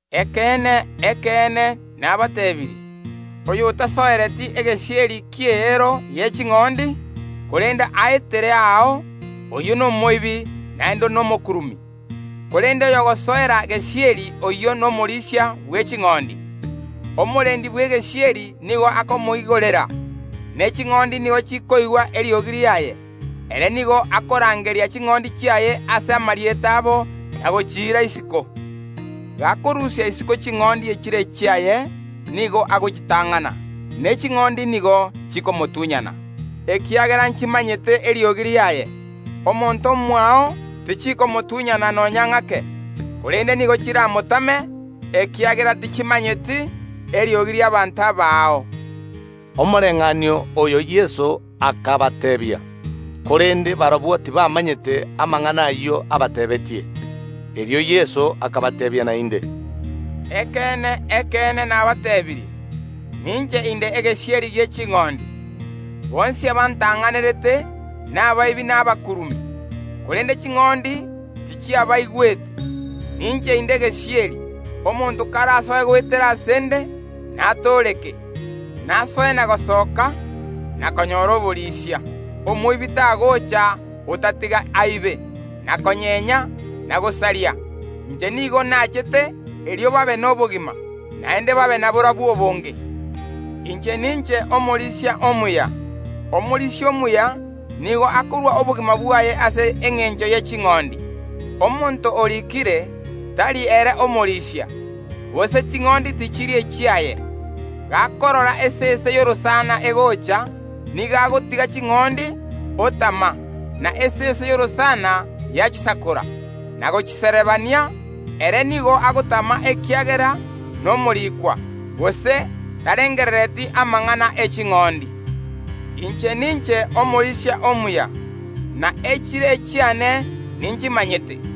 “Ekeene, ekeene, nabateebirie: Oyotasoereti egesieri ki’eero ye ching’ondi, korende aetere aao, oyio nomoibi naende nomokurumi. Korende oyogosoera gesieri oyio nomorisia bwe ching’ondi. Omorendi bw’egesieri nigo akomoigorera, ne ching’ondi nigo chikoigwa eriogi riaye; ere nigo akorangeria ching’ondi chiaye ase amarieta abo na gochiira isiko. Gakorusia isiko ching’ondi echire echiaye, nigo agochitang’ana, ne ching’ondi nigo chikomotunyana, ekiagera nchimanyete eriogi riaye. Omonto omoao tichikomotunyana nonya ng’ake, korende nigo chiramotame, ekiagera tichimanyeti eriogi ri’abaanto abaao.” Omoreng’anio oyo Yeso akabateebia, korende barabwo tibamanyete amang’ana ayio abateebeetie. Erio Yeso akabateebia naende, “Ekeene, ekeene, nabateebirie: Ninche inde egesieri gie ching’ondi. Bonsi abantang’anerete nabaibi na abakurumi, korende ching’ondi tichiabaigwete. Ninche inde egesieri; omonto karasoe goetera ase ’nde, natooreke, nasoe na gosoka, na konyora oborisia. Omoibi tagocha, otatiga aibe, na konyenya, na gosaria; inche nigo nachete erio babe nobogima, naende babe naborobwo ase obonge. Inche ninche Omorisia omuya; omorisia omuya nigo akorua obogima bwaye ase engencho ye ching’ondi. Omonto orikire, tari ere omorisia, gose ching’ondi tichiri echiaye; gakorora esese y’orosana egocha, nigo agotiga ching’ondi, otama, na esese y’orosana yachisakora, na gochiserebania. Ere nigo agotama ekiagera nomorikwa, gose tarengerereti amang’ana e ching’ondi. Inche ninche omorisia omuya, na echire echiane ninchimanyete,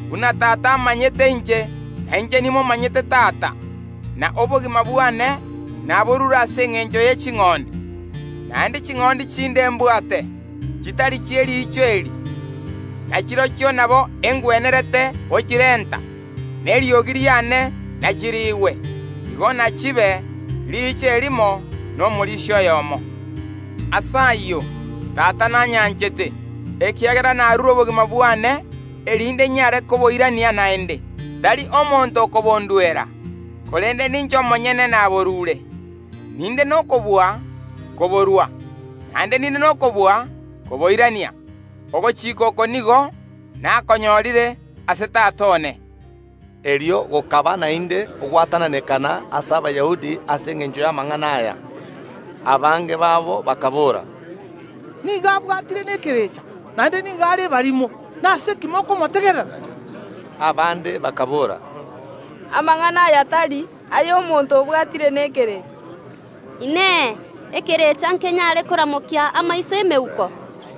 buna Tata amanyete inche, na inche nimomanyete Tata, na obogima bwane naborure ase engencho ye ching’ondi. Naende ching’ondi chinde mbwate, chitari chie riicho eri, na chirochio nabo engwenerete gochirenta, na eriogi riane nachiriigwe. Igo nachibe riicho erimo na omorisia oyomo. Ase ayio Tata nanyanchete, ekiagera narure obogima bwane, erinde inyare koboirania naende. Tari omonto okobonduera, korende ninche omonyene naborure. Ninde nokobua koborua; naende ninde nokobua koboirania. Ogochika oko nigo nakonyorire ase Tata one.” Erio gokaba naende ogwatananekana ase Abayahudi ase engencho y’amang’ana aya. Abange babo bakaboora, “Nigo abwatire nekerecha, naende nigo are ebarimo; nase ki mokomotegerera?” Abande bakaboora “Amang’ana aya tari ay’omonto obwatire nekerecha. Inee! Ekerecha nkenyare koramokia ’emeuko amaiso?”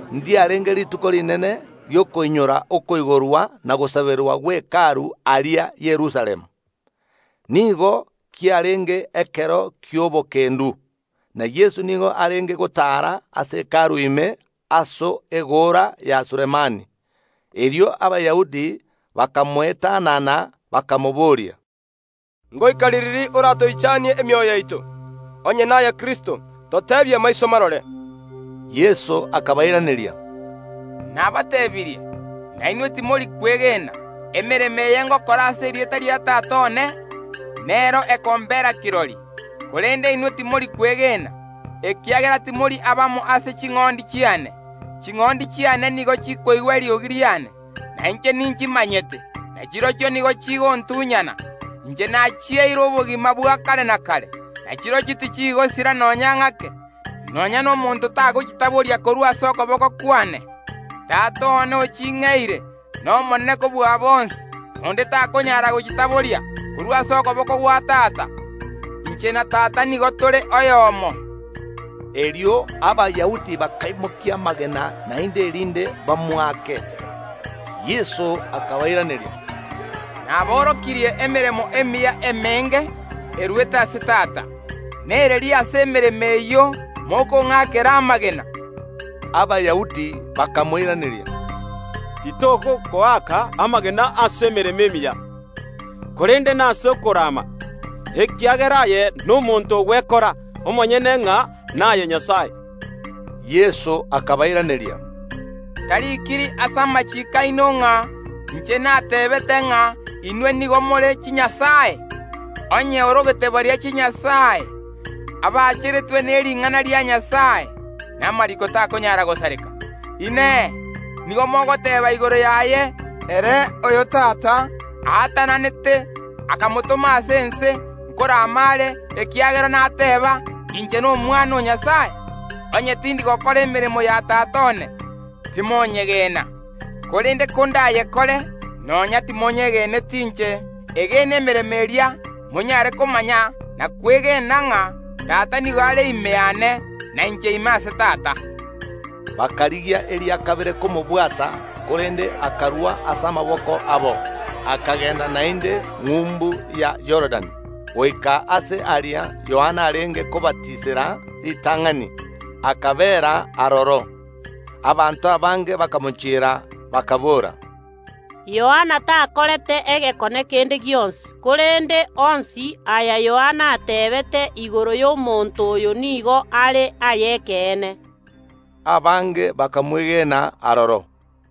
Ndiarenge Rituko Rinene ri’okoinyora okoigorwa na ogosaberwa gwe Hekalu aria Yerusalemu. Nigo kiarenge ekero ki’obokendu, na Yeso nigo arenge gotaara ase Hekalu ime, ase egoora ya Sulemani. Erio Abayahudi bakamoetanana, bakamobooria, “Ngoika ririri oratoichanie emioyo yaito? Onye naye Kristo, toteebia maiso marore.” Yeso akabairaneria, “Nabatebirie, na inwe timori kwegena; emeremo eye ngokora ase erieta ria Tata one, nero ekombera kirori. Korende inwe timori kwegena, ekiagera timori abamo ase ching’ondi chiane. Ching’ondi chiane nigo chikoigwa eriogi riane, na inche ninchimanyete, na chirochio nigo chigontunyana; inche nachieire obogima bwa kare na kare, na chirochio tichigosira nonya ng’ake, nonya nomonto tagochitaboria korwa ase okoboko kwane. Tata one oching’eire nomonene kobua bonsi, na onde takonyara gochitaboria korwa ase okoboko gwa Tata. Inche na Tata nigo tore oyomo.” Erio Abayahudi bakaimokia amagena naende, erinde bamoake. Yeso akabairaneria, “Naborokirie emeremo emiya emenge erwete ase Tata; nereri ase emeremo eyio mokong’akera amagena?” Abayahudi bakamoiraneria, “Titogokoaka amagena ase emeremo emiya, korende nase okorama, ekiagera aye nomonto ogwekora omonyene ng’a naye Nyasae.” Yeso akabairaneria, “Tarikiri ase amachiiko aino ng’a: Inche nateebete ng’a inwe nigo more chinyasae? Onye orogete baria chinyasae, abacheretwe ne ring’ana ria Nyasae (na amariiko takonyara gosareka), inee, nigo mogoteeba igoro yaye, ere oyo Tata aatananete akamotoma ase ense: Nkorama are, ekiagera nateba: Inche n’Omwana o Nyasae? Onye tindi gokora emeremo ya Tata one, timonyegena. Korende konda yekore, nonya timonyegeneti inche, egene emeremo eria, monyare komanya na kwegena ng’a Tata nigo are ime yane, na inche ime ase Tata.” Bakarigia eria kabere komobwata, korende akarua ase amaboko abo. Akagenda naende ng’umbu ya Yorodani goika aase aria Yohana arenge kobatisera ritang’ani, akabeera aroro. Abanto abange bakamochiera, bakaboora, “Yohana takorete egekone kende gionsi, korende onsi aya Yohana ateebete igoro y’omonto oyo nigo are ay’ekeene.” Abange bakamwegena aroro.